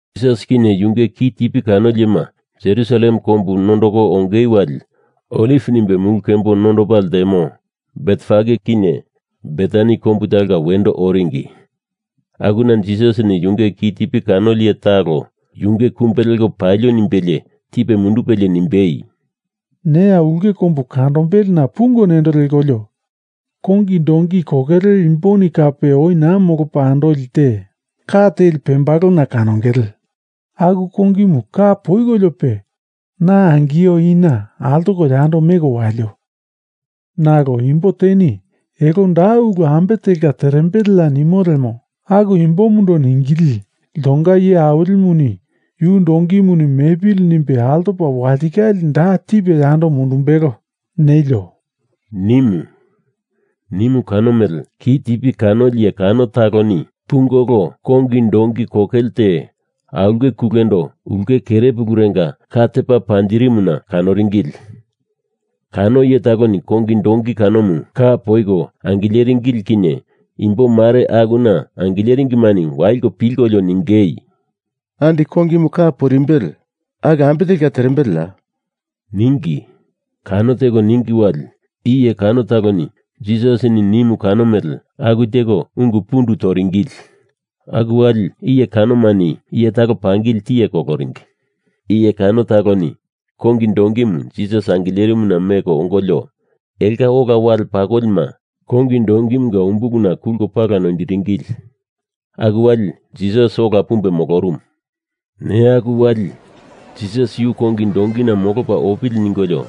Jisas kinye yunge kitipi kanoli iyema Jerusalem kombu nondoko onge wali Oliv nimbe mulu kembo nondopa ltemo Betfage kinye Betani kombu talonga wendo oringi. Akuna Jisasini yunge kitipi kanoli iye talo yunge kumbe lepa palio nimbelie tipe mundupelie nimbei, “Neya ulke kombu kandombelena pungo nendo lekolio kongi donki kokele imboni kape oi naa molopa andoli te ka teli pembalona kanongele. Aku kongimu ka poikoliope na angio ina altoko yando meko walio. Nalo imbo teni elo da ulu ambe telka terembeleya nimo lemo, aku imbomundo ningili ‘Iltonga Iye Awilimuni yu donkimuni mepili nimbe altopa walitikale da tipe yando mundumbelo,’ nelio,” nimu. Nimu kano mele kitipi kanoli iye kano taloni pungolo kongi donki kokele te aulke kulendo ulke kerepulurenga ka tepa perimuna kanoringili. Kano iye taloni kongi donki kanomu ka poiko angileringili kinye imbo mare akuna angileringimani waliko pilkolio ningei, “Andi kongimu ka poirimbele, aku ambe telka terembeleya?” ningi. Kano teko ningi wali iye kano taloni Jisasini nimu kano mele aku teko ungu pundu toringili. Aku wali iye kanomani iye talo pangili tiye koloringi. Iye kano taloni kongi donkimu Jisas angilerimuna meko ongolio elonga ola wale pakolima kongi donkimunga umbuluna kulko pala noindiringili. Aku wali Jisas ola pumbe molorumu. Neya aku wali, Jisas yu kongi donkina molopa opili ningolio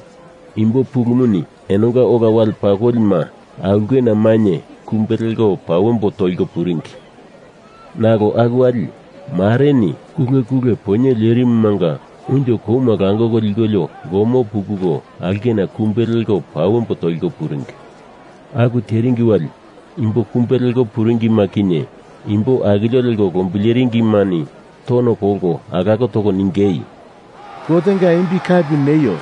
imbo pulumuni enonga ola wale pakolima aulkena mainye kumbe leko pawembo toliko puringi. Nalo aku wali, mareni kulekule poinye lerimumanga unjo koma langoko likolio gomo pukuko aulkena kumbe leko pawembo toliko puringi. Aku teringi wali imbo kumbe leko puringima kinye imbo akilio leko lombileringimani tono kolko alako toko ningei, “Gotenga imbi kapi neio!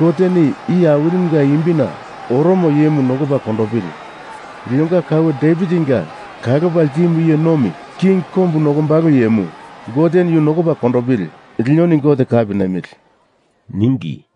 Goteni iye awilimunga imbina oromo iyemu nokopa kondopili! Linonga kaue Devitinga kalopa ltimu iye nomi king kombu nokombalo iyemu, Goteni yu nokopa kondopili! Linoni Gote kapi nemili,” ningi.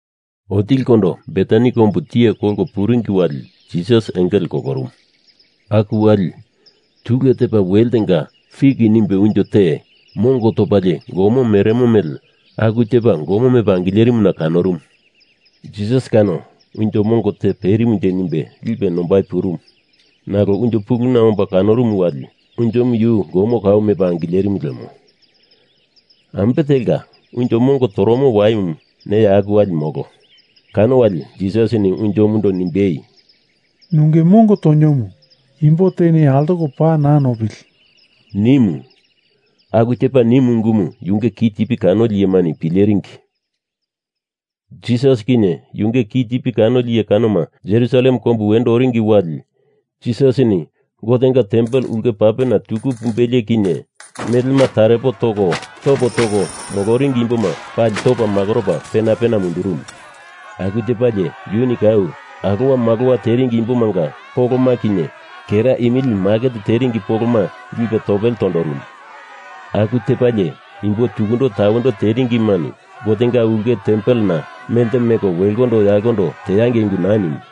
Otilikondo Betani kombu tiye kolko puringi wali Jisas engele kolorumu. Aku wali, tule tepa weltenga fik nimbe unjo te mongo topalie gomo meremo mele aku tepa gomo mepa angilerimuna kanorumu. Jisas kano unjo mongo te peremonje nimbe lipe nombai purumu. Nalo unjo puluna omba kanorumu wali, unjomu yu gomo kau mepa angilerimu lemo. Ambe telka unjo mongo toromo waimu neya aku wali molo. Kano wali Jisasini unjomundo nimbei, “Nunge mongo toniomu imbo teni altoko paa naa nopili,” nimu. Aku tepa nimu ungumu yunge kitipi kanoli iyemani pileringi. Jisas kinye yunge kitipi kanoli iye kanoma Jerusalem kombu wendo oringi wali Jisasini Gotenga tempel ulke papena tuku pumbelie kinye melema tarepo toko topo toko moloringi imboma pali topa makoropa pena pena mundurumu. Aku tepalie yuni kou alowamalowa teringi imbomanga poloma kinye kera imili maket teringi poloma lipe topele tondorumu. Aku tepalie imbo tukundo tawendo teringimani Gotenga ulke tempelena melte meko welkondo yalkondo teangei ungu naa nimu.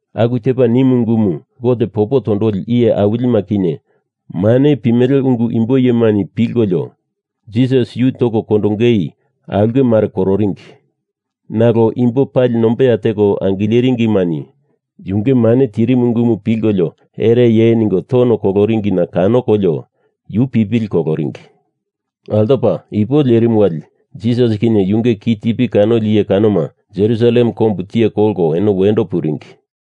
Aku tepa nimu ungumu Gote popo tondoli iye awilima kinye mane pimele ungu imbo iyemani pilkolio Jisas yu toko kondongei aulke mare kororingi. Nalo imbo pali nombeya teko angileringimani yunge mane tirimu ungumu pilkolio ereye ningo tono koloringina kanokolio yu pipili koloringi. Altopa ipo lerimu wali Jisas kinye yunge kitipi kanoli iye kanoma Jerusalem kombu tiye kolko eno wendo puringi.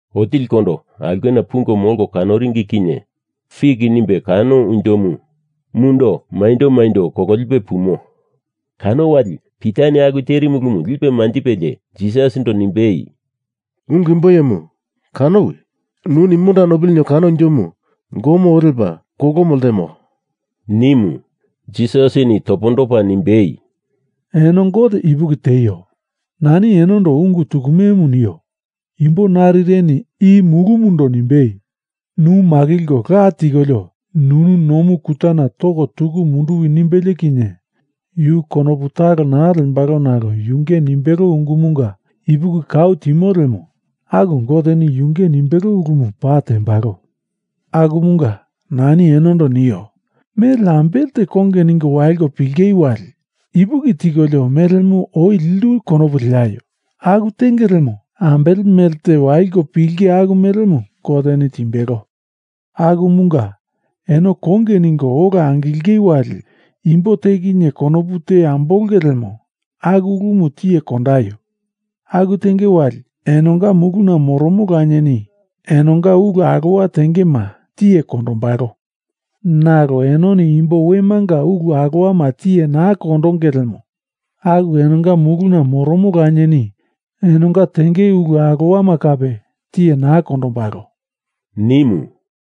Otilikondo aulkena pungo molko kanoringi kinye fik nimbe kano unjomu mundo maindo maindo kololipe pumo. Kano wali Pitani aku terimu ulumu lipe manjipelie Jisasindo nimbei, “Ungu imbo iyemu, kanowi! Nuni monda nopili ninio kano unjomu gomo oo lepa kolomo ltemo,” nimu. Jisasini topondopa nimbei, “Eno Gote ipuki tieio. Nani enondo ungu tukumemu nio. Imbo narireni i mulumundo nimbei, nu makilko la tikolio nunu nomu kutana toko tuku munduwi nimbelie kinye yu konopu talo naa lembalo nalo yunge nimbelo ungumunga ipuki kau timo lemo, aku Goteni yunge nimbelo ulumu paa tendembalo. Akumunga nani enondo nio, mele ambele te konge ningo waliko pilingei wali, ipuki tikolio melemu oi lindu konopu leaio, aku tenge lemo, ambele mele te waliko pilinge aku melemu Goteni timbelo. Akumunga eno konge ningo ola angilingei wali, imbo te kinye konopu te ambolongei lemo, aku ulumu tiye kondaio. Aku tenge wali enonga muluna moromo Lanieni enonga ulu alowa tengema tiye kondombalo. Nalo enoni imbo wemanga ulu alowama tiye naa kondonge lemo, aku enonga muluna moromo Lanieni enonga tenge ulu alowama kape tiye naa kondombalo,” nimu.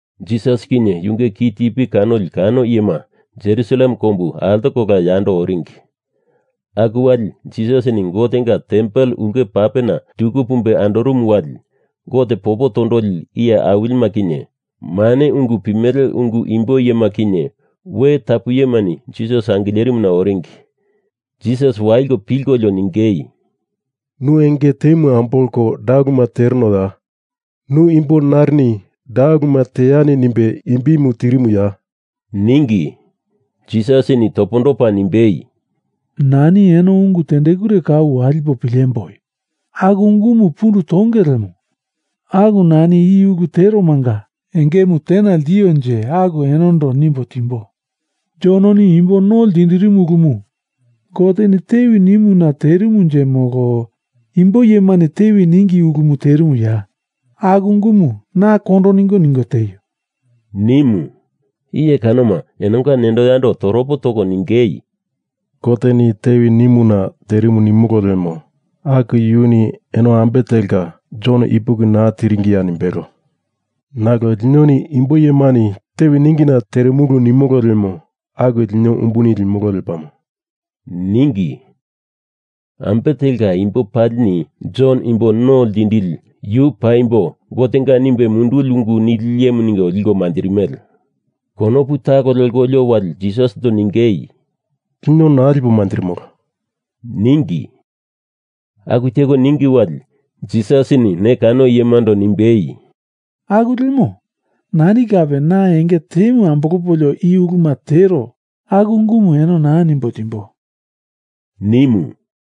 Jisas kinye yunge kitipi kanoli kano iyema Jerusalem kombu altokola yando oringi. Aku wali Jisasini Gotenga Tempel ulke papena tuku pumbe andorumu wali Gote popo tondoli iye awilima kinye, mane ungu pimele ungu imbo iyema kinye, we tapu iyemani Jisas angilerimuna oringi. Jisas waliko pilkolio ningei, “Nu enge temu ambolko da uluma terenoya? Nu imbo narini da uluma teani nimbe imbimu tirimuya?” ningi. Jisasini topondopa nimbei, “Nani eno ungu tendekure kau walipo pilemboi. Aku ungumu pundu tonge lemo aku nani i ulu teromanga engemu tena ltionje aku enondo nimbo timbo. Jononi imbo no ltindirimu ulumu Goteni tewi nimuna terimunje molo imbo iyemani tewi ningi ulumu terimuya? Aku ungumu na kondo ningo ningo tieio,” nimu. Iye kanoma enonga nendo yando toropo toko ningei, “Goteni tewi nimuna terimu nimolo lemo, aku yuni eno ambe telka Jon ipuki naa tiringiya nimbelo. Nalo linoni imbo iyemani tewi ningina terimu nimolo lemo aku lino umbuni limolo lepamo,” ningi. Ambe telka imbo palini Jon Imbo No Ltindili yu paimbo Gotenga nimbe munduli ungu nili iyemu ningo liko manjirimele. Konopu talo lekolio wali Jisasindo ningei, “Lino naa lipo manjirimolo,” ningi. Aku teko ningi wali Jisasini ne kano iyemando nimbei, “Aku lemo nani kape na enge temu ambolopolio i uluma tero aku ungumu eno naa nimbo timbo,” nimu.